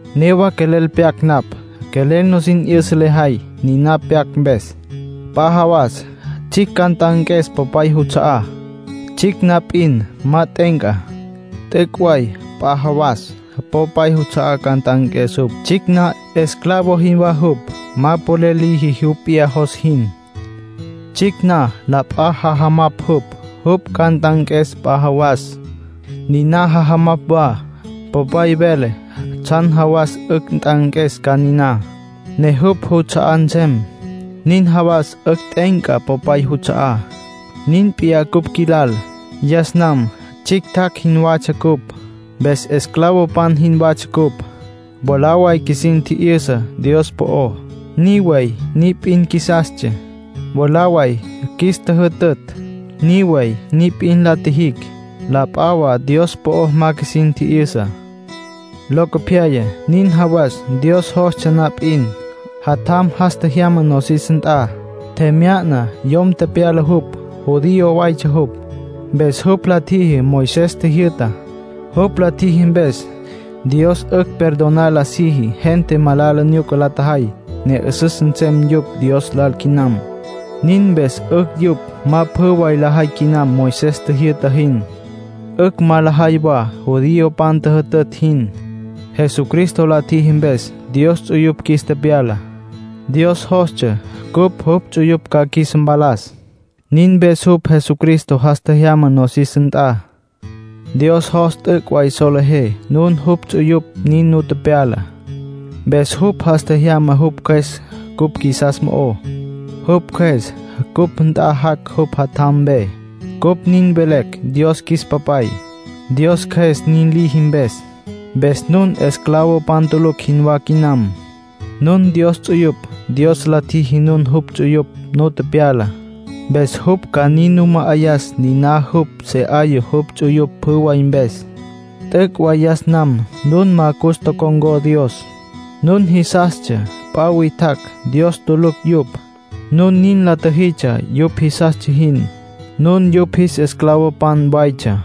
Newa quelel pyac napj. Quelel nusin 'yüsa lejay, niná pyac mpes. P'a jawas tsjicj ca nt'anques popay juts'a'á. Tsjicj na p'in, ma t'e'enca. T'üc' way p'a jawas popay juts'a'á ca nt'anques jupj. Tsjicj na, esclavo jinwá jupj. Ma polel liji jupj p'iyá jos jin. Tsjicj na, la p'a jajamapj jupj. Jupj ca nt'anques p'a jawas, niná jajamapj wa. Popay vele tsjan jawas 'ücj nt'anques ca niná, ne jupj juts'a'á nsem. Nin jawas 'ücj t'e'enca popay juts'a'á. Nin p'iyá cupj qjuilal. Yas nam tsjictjacj jinwatsja cupj. Mpes esclavopan jinwatsja cupj. Mwalá way qjuisin tji'yüsa Dios po'ó, ni way ni p'in qjuisastsja. Mwalá way qjuis tjüjütütj, ni way ni p'in la tjijicj. La p'a wa Dios po'o ma qjuisin tji'yüsa. Locopyaya, nin jawas Dios jostsja na p'in, Jatjam jas tjejyama nosis nt'a. Tjemya'na, yom tepyala jupj. Judío waytsja jupj. Mpes jupj la tjiji Moisés tjijyü'tá. Jupj la tjiji mpes, Dios 'ücj perdonar la siji gente malala nyuca la tjajay, ne 'üsüs nsem yupj Dios lal quinam. Nin mpes 'ücj yupj ma pjü way lajay quinam Moisés tjijyü'ta jin. 'Ücj ma lajay wa judiopan tjüjütütj jin. Jesucristo la tjiji mpes, Dios ts'uyupj qjuis tepyala. Dios jostsja cupj jupj ts'uyupj ca qjuis mpalas; nin mpes jupj Jesucristo jas tjejyama nosis nt'a. Dios jos t'üc' way solejé nun jupj ts'uyupj, nin nu tepyala. Mpes jupj jas tjejyama jupj Cjües cupj qjuisas mo'ó. Jupj Cjües cupj nt'a jac' jupj Jatjam mpe. Cupj nin velecj Dios “qjuis Papay”, Dios Cjües nin liji mpes. Mpes nun esclavopan tulucj jinwá quinam. Nun Dios ts'uyupj. Dios la tjiji nun jupj ts'uyupj nu tepyala, mpes jupj ca nin nu ma'ayas niná jupj se 'aya jupj ts'uyupj pjü way mpes. T'üc' way yas nam nun ma cus tocon̈có Dios. Nun jisastsja p'a witjacj, Dios tulucj yupj. Nun nin la tjüjitsja yupj jisastsja jin. Nun yupj jis esclavopan waytsja.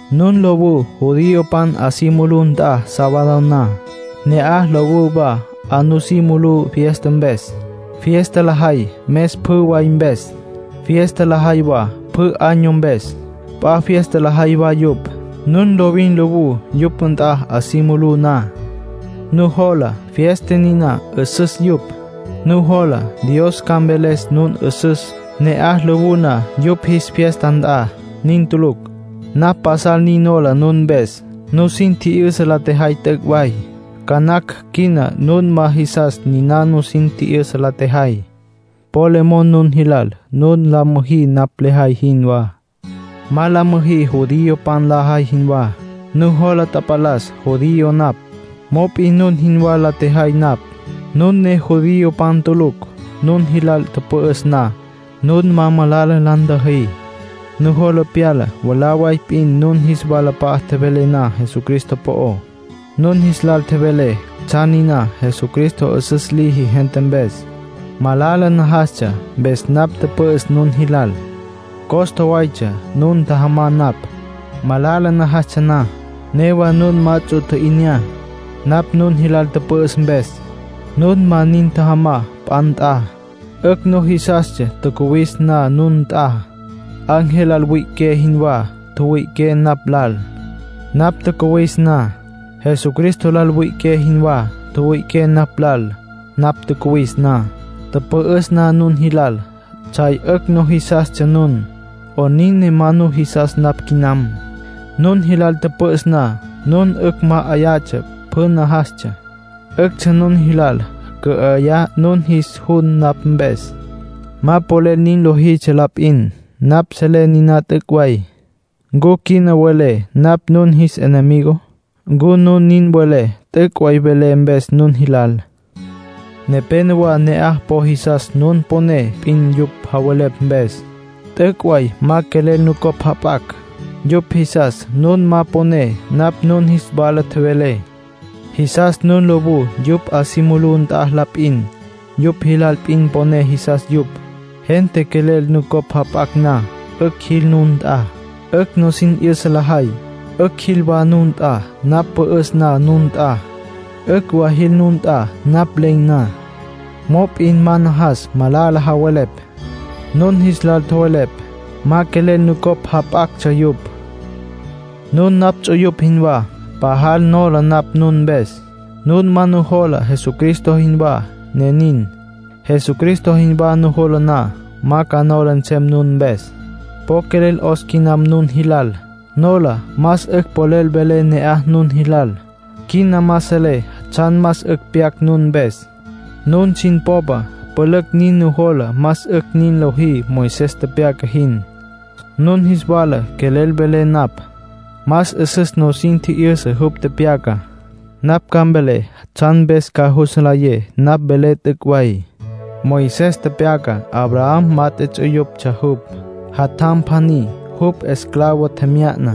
Nun lowú judiopan 'a si mulú nt'a sábado na. Ne'aj lowú wa 'a nusí mulú fiesta mpes. Fiesta lajay mes pjü way mpes. Fiesta lajay wa pjü año mpes. P'a fiesta lajay wa yupj. Nun lovin lowú yupj nt'a 'a si mulú na. Nujola fiesta niná 'üsüs yupj. Nujola Dios ca mveles nun 'üsüs, ne'aj lowú na yupj jis fiesta nt'a. Nin tulucj. Napj pasal nin nola nun mpes. Nusin tji'yüsa la tjejay t'üc' way. Ca nacj quina nun ma jisas niná nusin tji'yüsa la tjejay. Po le mon nun jilal nun la müjí napj lejay jinwá. Ma la müjí judiopan lajay jinwá. Nujola tapalas judío napj. Mop'in nun jinwá la tjejay napj, nun ne judiopan tulucj. Nun jilal tüpü'üs na, nun ma malala la ntjüjí. Nujola pyala mwalá way p'in nun jis walap'a'a tjevelé na Jesucristo po'ó. Nun jis lal tjevelé tsjan niná Jesucristo 'üsüs liji gente mpes. Malala najastsja mpes napj tüpü'üs nun jilal. Costa waytsja nun ntjajamá napj, malala najastsja na. Newa nun ma ts'u tji'inyá, napj nun jilal tüpü'üs mpes. Nun ma nin tjajamá p'a nt'a. 'Ücj nujisastsja tjacuwis na nun nt'a. Ángel lal wüi'iqué jinwá tjüwüi'iqué napj lal, napj tjacuwis na. Jesucristo lal wüi'iqué jinwá tjüwüi'iqué napj lal, napj tjacuwis na. Tüpü'üs na nun jilal, tsjay 'ücj nujisastsja nun. ¿'Onin ne ma nujisas napj quinam? Nun jilal tüpü'üs na, nun 'ücj ma'ayatsja pjü najastsja. 'Üctsja nun jilal cü'ayá nun jis jun napj mpes. Ma polel nin lojitsja la p'in. Napj selé niná t'üc' way. ¿Ncu quina welé napj nun jis enemigo? ¿Ncu nun nin welé t'üc' way velé mpes nun jilal? Nepénowa ne'aj po jisas nun poné p'in yupj javelepj mpes. T'üc' way ma quelel nucopj jap'acj. Yupj jisas nun ma poné napj nun jis wala tjevelé. Jisas nun lowú yupj 'a si mulú nt'a la p'in. Yupj jilal p'in poné jisas yupj. Gente quelel nucopj jap'acj na, 'ücj jil nun nt'a. 'Ücj nusin 'yüsa lajay. 'Ücj jil wa nun nt'a napj pü'üs na nun nt'a. 'Ücj wa jil nun nt'a napj len̈ na. Mop'in ma najas malala javelepj. Nun jis lal tjowelepj, ma quelel nucopj jap'actsja yupj. Nun napj ts'uyupj jinwá. Pajal nola napj nun mpes; nun ma nujola Jesucristo jinwá, ne nin. Jesucristo jinwá nujola na, ma ca nola nsem nun mpes. Po quelel 'os quinam nun jilal. Nola más 'ücj polel velé ne'aj nun jilal. Quina ma selé tsjan más 'ücj pyac nun mpes. Nun sin popa pülücj nin nujola más 'ücj nin lojí Moisés tepyaca jin. Nun jis wala quelel velé napj, ma 'üsüs nusin tji'yüsa jupj tepyacá. Napj ca mvelé tsjan mpes ca jus nlayé napj velé t'üc' way. Moisés tepyaca Abraham mat'e ts'uyuptsja jupj. Jatjam pjaní jupj esclavo tjemya'na.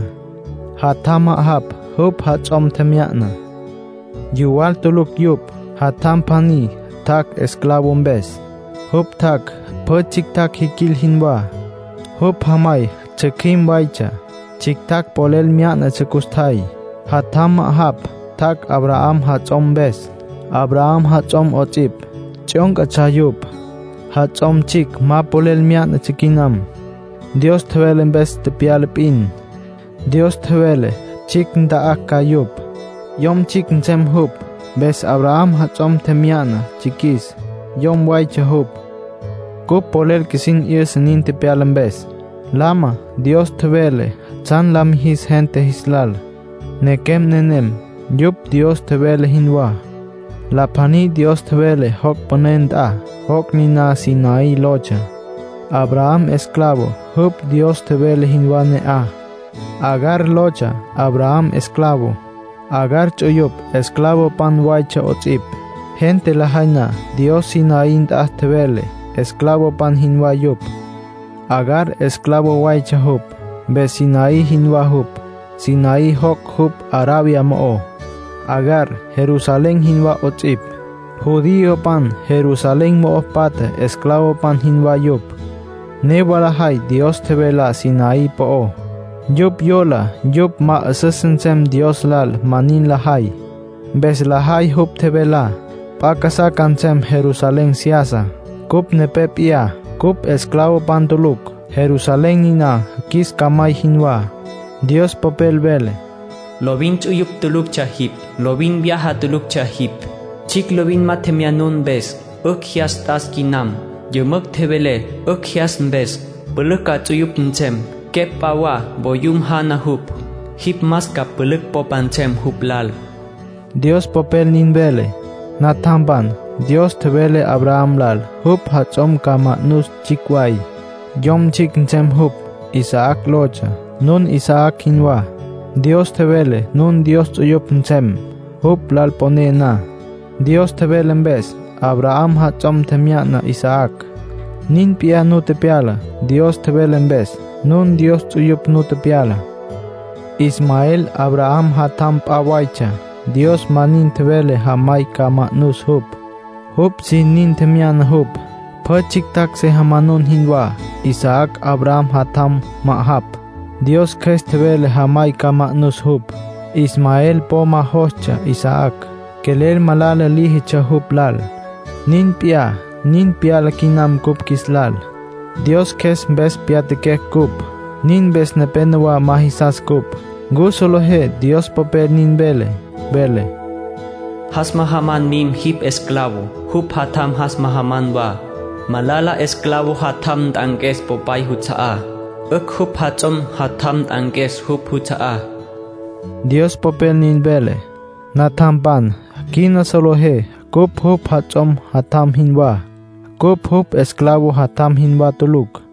Jatjam ma'ajapj jupj jats'om tjemya'na. Yuwal tulucj yupj. Jatjam pjaní tjac' esclavo mpes. Jupj tjac' pjü tsjictjacj jiquil jinwá. Jupj jamay tsjücjüim waytsja, tsjictjacj polel myá'natsja custjay. Jatjam ma'ajapj tjac' Abraham jats'om mpes. Abraham, jats'om 'ots'ipj, tsjyóncatsja yupj. Jats'om tsjicj ma polel myá'natsja quinam. Dios tjevele mpes tepyala p'in. Dios tjevele tsjicj nta'acj ca yupj, cocoy nsem jupj. Mpes Abraham jats'om tjemya'na tsjiquis, cocoy waytsja jupj. Cupj polel qjuisin 'yüsa nin tepyala mpes. Lama Dios tjevele tsjan la mijis gente jis lal. Nequem nenem, yupj Dios tjevele jinwá. La pjaní Dios tjevele joc' püné nt'a, joc' niná Sinaí lotsja. Abraham esclavo, jupj Dios tjevele jinwá ne'aj. Agar lotsja Abraham esclavo. Agar ts'uyupj esclavopan waytsja 'ots'ipj. Gente lajay na Dios Sinaí nt'a tjevele, esclavopan jinwá yupj. Agar esclavo waytsja jupj, mpes Sinaí jinwá jupj. Sinaí joc' jupj Arabia mo'ó. Agar Jerusalén jinwá 'ots'ipj. Judiopan Jerusalén mo'o patja esclavopan jinwá yupj. Newa lajay Dios tjevelá Sinaí po'ó. Yupj yola yupj ma 'üsüs nsem Dios lal ma nin lajay. Mpes lajay jupj tjevelá. P'a casá ca nsem Jerusalén seyasa. Cupj nepé p'iyá. Cupj esclavopan tulucj. Jerusalén niná qjuis camay jinwá. Dios Popel vele: “Lovin ts'uyupj tuluctsja jipj. Lovin vyaja tuluctsja jipj, tsjicj lovin ma tjemyanun mpes. ¡'Ücj jyas t'as quinam! ¡Yümücj tjevele 'ücj jyas mpes! Pülücj ca ts'uyupj nsem. Quepj p'a wa, voyum jana jupj. Jipj más ca pülücj popa nsem jupj lal.” Dios Popel nin vele. Natjampan, Dios tjevele Abraham lal jupj jats'om ca ma'nus tsjicj way; cocoy nsem jupj. Isaac lotsja. Nun Isaac jinwá. Dios tjevele nun Dios ts'uyupj nsem, jupj lal poné na. Dios tjevele mpes, Abraham jats'om tjemya'na Isaac. Nin p'iyá nu tepyala. Dios tjevele mpes, nun Dios ts'uyupj nu tepyala. Ismael Abraham jatjam p'a waytsja. Dios ma nin tjevele jamay ca ma'nus jupj. Jupj sin nin tjemya'na jupj, pjü tsjictjacj se jamanun jinwá. Isaac Abraham jatjam ma'ajapj. Dios Cjües tjevele jamay ca ma'nus jupj. Ismael po ma jostsja Isaac, quelel malala líjitsja jupj lal. Nin p'iyá nin pyala quinam cupj qjuis lal. Dios Cjües mpes pyatjaquecj cupj; nin mpes nepénowa ma jisas cupj. ¿Ncu solejé Dios Popel nin vele? Vele: “Jas majaman mim jipj esclavo, jupj jatjam jas majaman wa. Malala esclavo jatjam nt'anques popay juts'a'á. 'Ücj jupj jats'om jatjam nt'anques jupj juts'a'á”, Dios Popel nin vele. Natjampan, quina solejé cupj jupj jats'om jatjam jinwá. Cupj jupj esclavo jatjam jinwá tulucj.